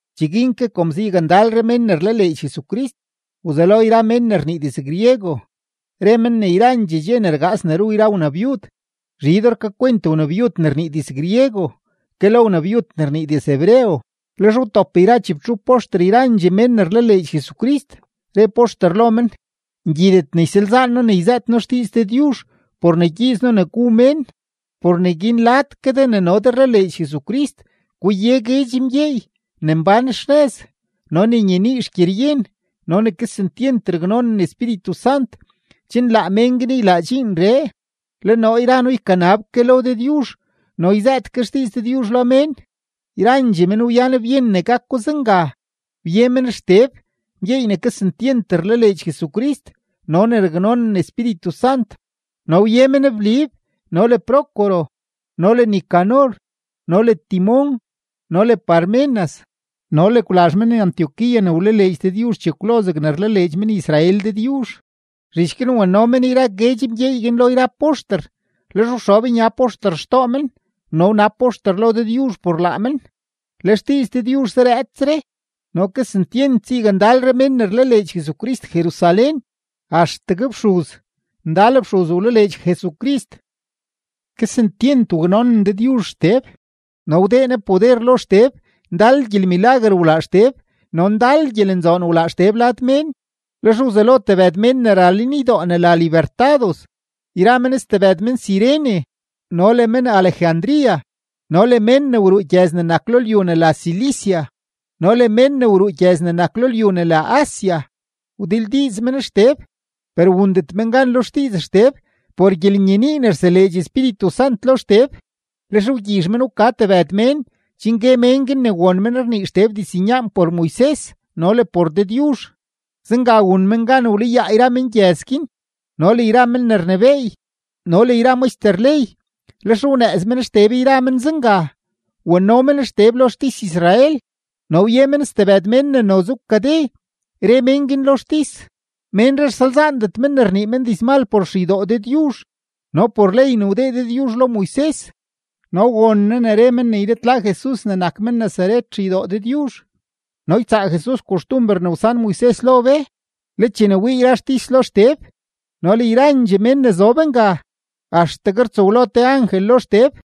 Cheguin ke kom zayakndalre mén ne rlaleedx Jesucrist, wzelo yra mén ne rnii diz-griego re men ne yrandxee dxe ne rgaas ne ru yra wnabyud, zhidoo rkakwent wnabyud ne rnii diz-griego ke lo wnabyud ne rnii diz-hebreo. Lex wtop yra chibtxup poxter yrandxee mén ne rlaleedx Jesucrist, re poxter lo men: ―Ngyidet ne ysalzaan noo ne yzëët noo xdiiz Dëdyuzh por ne ygyiiz noo ne gu mén. Por neguin lad ke de ne no de rlaleedx Jesucrist guye guedx mgyeey ne mbán xnëz no ne nyenii xgyeryen no ne kesentyent raknonen Espíritu Sant, chen laa mén guin ylaa dxiinree. Le noo yra noo ykanab ke lo Dëdyuzh no yzëët ke xdiiz Dëdyuzh lo mén. Yrandxee men wyan byen ne gako zenga. Wye men Xteb, mgyeey ne kesentyent rlaleedx Jesucrist no ne raknonen Espíritu Sant, no wye men Blib no le Prócoro no le Nicanor no le Timón no le Parmenas, no le Kwlazh men-Antioquía ne wlaleedx Dëdyuzh chekwlo zegne rlaleedx men-Israel Dëdyuzh. Zhich guin wano men yra guedx mgyeey guin lo yra poxter, lex wxob nya poxter xtoo men no wnab poxter lo Dëdyuzh por laa men. Le xdiiz Dëdyuzh zarëëtsre no kesentyent zayakndalre mén ne rlaleedx Jesucrist Jerusalén, axtegue fxuz, ndal fxuz wlaleedx Jesucrist. Kesentyent waknonen Dëdyuzh Xteb no wdee Ne poder lo Xteb, ndal gyelmilaguer wlaa Xteb no ndal gyelenzoon wlaa Xteb lad mén. Lex wzelo tebëd mén ne ra lenydoo ne la Libertados yra men stebëd men-Cirene no le men-Alejandría no le mén ne wruu gyëz ne nak lo lyu ne la Cilicia no le mén ne wruu gyëz ne nak lo lyu ne la Asia, wdildiiz men Xteb. Per wundet men gan lo xdiiz Xteb por gyelenyenii ne rseleedx Espíritu Sant lo Xteb. Lex wgyizh men wka tebëd mén chen gue mén guin ne won men rnii Xteb diznyaan por Moises no le por Dëdyuzh. Zenga wun men gan wlayaa yra mengyëz guin no le yra men ne rnebééy no le yra maxter ley, lex wnëëz men Xteb yra men zenga, wano men Xteb lo xtis-Israel. No wye men stebëd mén ne noze wkade, re mén guin lo xtis: ―Ménree rsalzaandet men ne rnii men dizmal por xeydoo Dëdyuzh no por ley ne wdee Dëdyuzh lo Moises. No won noo ne re men ne ylitla Jesus ne nak men-Nazaret xeydoo Dëdyuzh no ytsaa Jesus koxtumber ne wsan Moises lo be. Le chene wii yra xtis lo Xteb no le yrandxee mén ne zob nga, axtegue rtsow lo te angel lo Xteb.